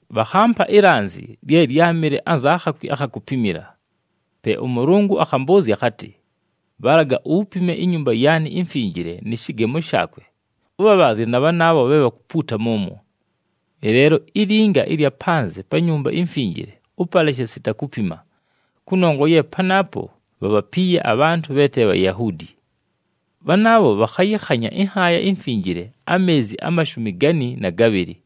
Bhakhampa ilanzi lye lyámɨle anza khakwi akha kupimila. Pe ʉMʉlʉngʉ akhambʉʉzya akhatɨ, “Bhalaga upime iNyumba yaanɨ iMfinjile nɨ shɨgemo shaakwe, ʉbhabhaazye na bhanaabho bhe bhakupuuta mʉmwo. Ɨleelo ilinga ɨlya panzɨ pa Nyumba iMfinjile ʉpaleshe sita kupima, kʉnongwa ye panaapo bhabhapiiye abhantʉ bhe te Bhayahuudi. Bhanaabho bhakhayɨkhanya ɨNhaaya iMfinjile ameezi amashumi gani na gabhɨlɨ.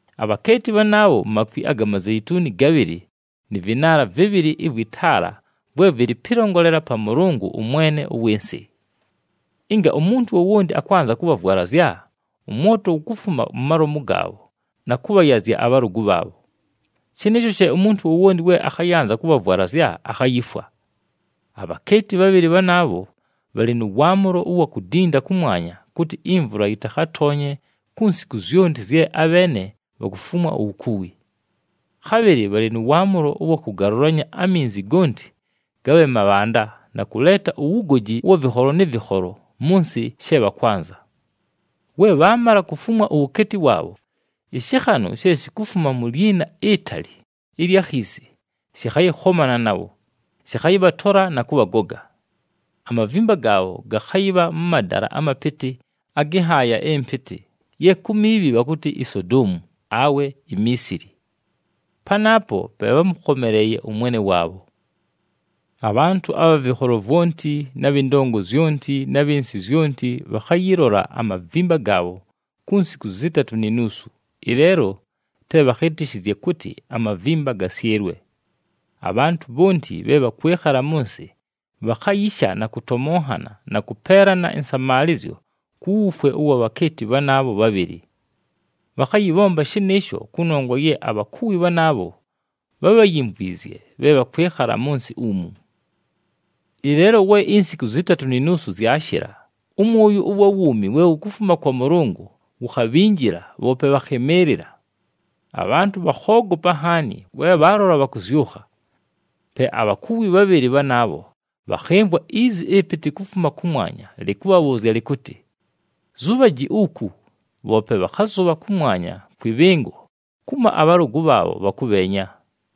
Abhakeeti bhanaabho, makwi aga mazeituni gabhɨlɨ nɨ vɨnaala vɨbhɨlɨ ɨvwɨ taala vwe vɨlɨ pɨlongolela pa Mʉlʉngʉ, ʉMwene ʉwɨ nsɨ. Ɨnga umuntu wowonti akwanza kʉbhavwalazya, ʉmwoto wukufuma mu malomu gaabho na kʉbhayazya abhalʉgʉ bhaabho. Shɨnɨɨsho she umuntu wowonti we akhayanza kʉbhavwalazya, akhayifwa. Abhakeeti bhabhɨlɨ bhanaabho bhalɨ nʉ waamʉlo ʉwa kudinda kʉmwanya, kʉtɨ imvula yɨtakhatoonye ku nsiku zyonti zye abheene bhakufumwa uwukuwi. Khabhɨlɨ bhalɨ nʉ waamʉlo ʉwa kʉgalʉlanya aminzi gonti gabhe mabhanda na kʉleeta uwugoji ʉwa vɨkholo nɨ vɨkholo mʉ nsɨ she bhakwanza. We bhaamala kufumwa uwukeeti waabho, ɨshɨkhanʉ she shikufuma mu lyina itali ɨlya khiisi shɨkhayɨkhomana nabho, shɨkhayɨbhatola na kʉbhagoga. Amavimba gaabho gakhayɨbha mʉ madala amapɨtɨ agɨ nhaaya ɨmpɨtɨ, ye ku miibhi bhakʉtɨ iSodoomu awe iMiisili. Panaapo pe bhámʉkhomeleeye ʉMwene waabho. Abhantʉ abha vɨkholo vwonti na bhɨ ndongo zyonti na bhɨ nsɨ zyonti, bhakhayɨlola amavimba gaabho ku nsiku zɨtatʉ ni nuusu, ɨleelo te bhakhɨtɨshɨzye kʉtɨ amavimba gasyɨlwe. Abhantʉ bhonti bhe bhakwɨkhala mʉ nsɨ, bhakhayisha na kʉtomonhana na kʉpeelana ɨnsamaalɨzyo ku wufwe ʉwa bhakeeti bhanaabho bhabhɨlɨ. Bhakhayɨbhomba shɨnɨɨsho, kʉnongwa ye abhakuwi bhanaabho bhábhayimvwizye bhe bhakwɨkhala mʉ nsɨ umu. Ɨleelo we insiku zɨtatʉ ni nuusu zyashɨla, ʉmwʉyʉ ʉwa wuumi we wukufuma kwa Mʉlʉngʉ wukhabhinjila, bhoope bhakhɨmɨɨlɨla. Abhantʉ bhakhoogopa nhaani we bhaalola bhakʉzyʉkha. Pe abhakuwi bhabhɨlɨ bhanaabho bhakhɨmvwa izi ɨpɨtɨ kufuma kʉmwanya lɨkʉbhabhʉʉzya lɨkʉtɨ, “Zubhaji uku!” Bhoope bhakhazʉbha kʉmwanya kwɨ bhɨngo kumo abhalʉgʉ bhaabho bhakʉbheenya.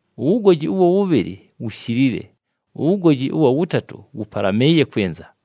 Uwugoji ʉwa wʉbhɨlɨ wushilile, uwugoji ʉwa wʉtatʉ wʉpalamɨɨye kwɨnza.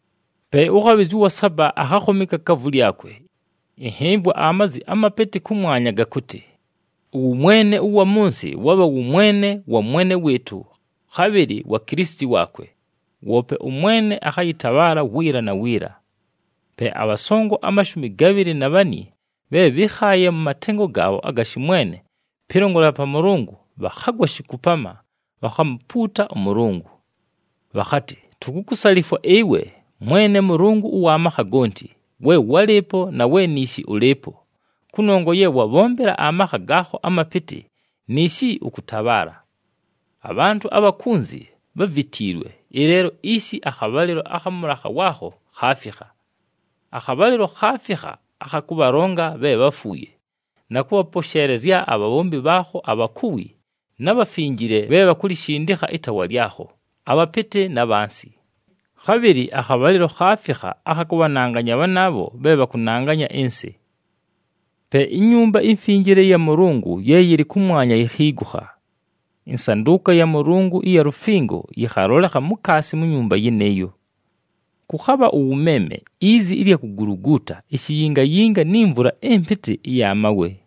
Pe ʉkhabhɨzya ʉwa saba akhakhoma ikakaavu lyakwe. Ɨnhɨmvwa amazi amapɨtɨ kʉmwanya, gakʉtɨ, “Ʉwʉmwene ʉwa mʉ nsɨ wabha wʉmwene wa Mwene wɨɨtʉ, khabhɨlɨ wa Kilisiti waakwe, woope ʉMwene akhayɨtabhaala wiila na wiila.” Pe abhasongo amashumi gabhɨlɨ na bhani bhe bhɨ́khaaye mʉ matengo gaabho aga shɨmwene pɨlongolela pa Mʉlʉngʉ bhakhagwa shikupama, bhakhamupuuta ʉMʉlʉngʉ. Bhakhatɨ, “Tukukusalifwa ɨwe, Mwene Mʉlʉngʉ ʉwa makha gonti, we wálɨɨpo na we niishi ʉlɨɨpo, kʉnongwa ye wabhombela amakha gaakho amapɨtɨ, niishi ʉkʉtabhaala. Abhantʉ abha kunzi bhávitiilwe, ɨleelo ishi akhabhalɨlo akha mʉlakha waakho khaafikha. Akhabhalɨlo khaafikha akha kʉbhalonga bhe bháfuuye na kʉbhaposheelezya abhabhombi bhaakho abhakuwi, na bhafinjile bhe bhakulishindikha ɨtaawa lyakho, abhapɨtɨ na bhansi. Khabhɨlɨ akhabhalɨlo khaafikha akha kʉbhananganya bhanaabho bhe bhakʉnanganya ɨnsɨ.” Pe iNyumba iMfinjile ɨya Mʉlʉngʉ ye yɨlɨ kʉmwanya yikhiigukha. Ɨnsandʉʉka ya Mʉlʉngʉ ɨya lufingo yɨkhalolekha mukaasi mu nyumba yɨnɨɨyo. Kʉkhabha ʉwʉmeeme, izi ɨlya kuguluguuta, ishiyingayinga, ni mvula ɨmpɨtɨ ɨya mawe.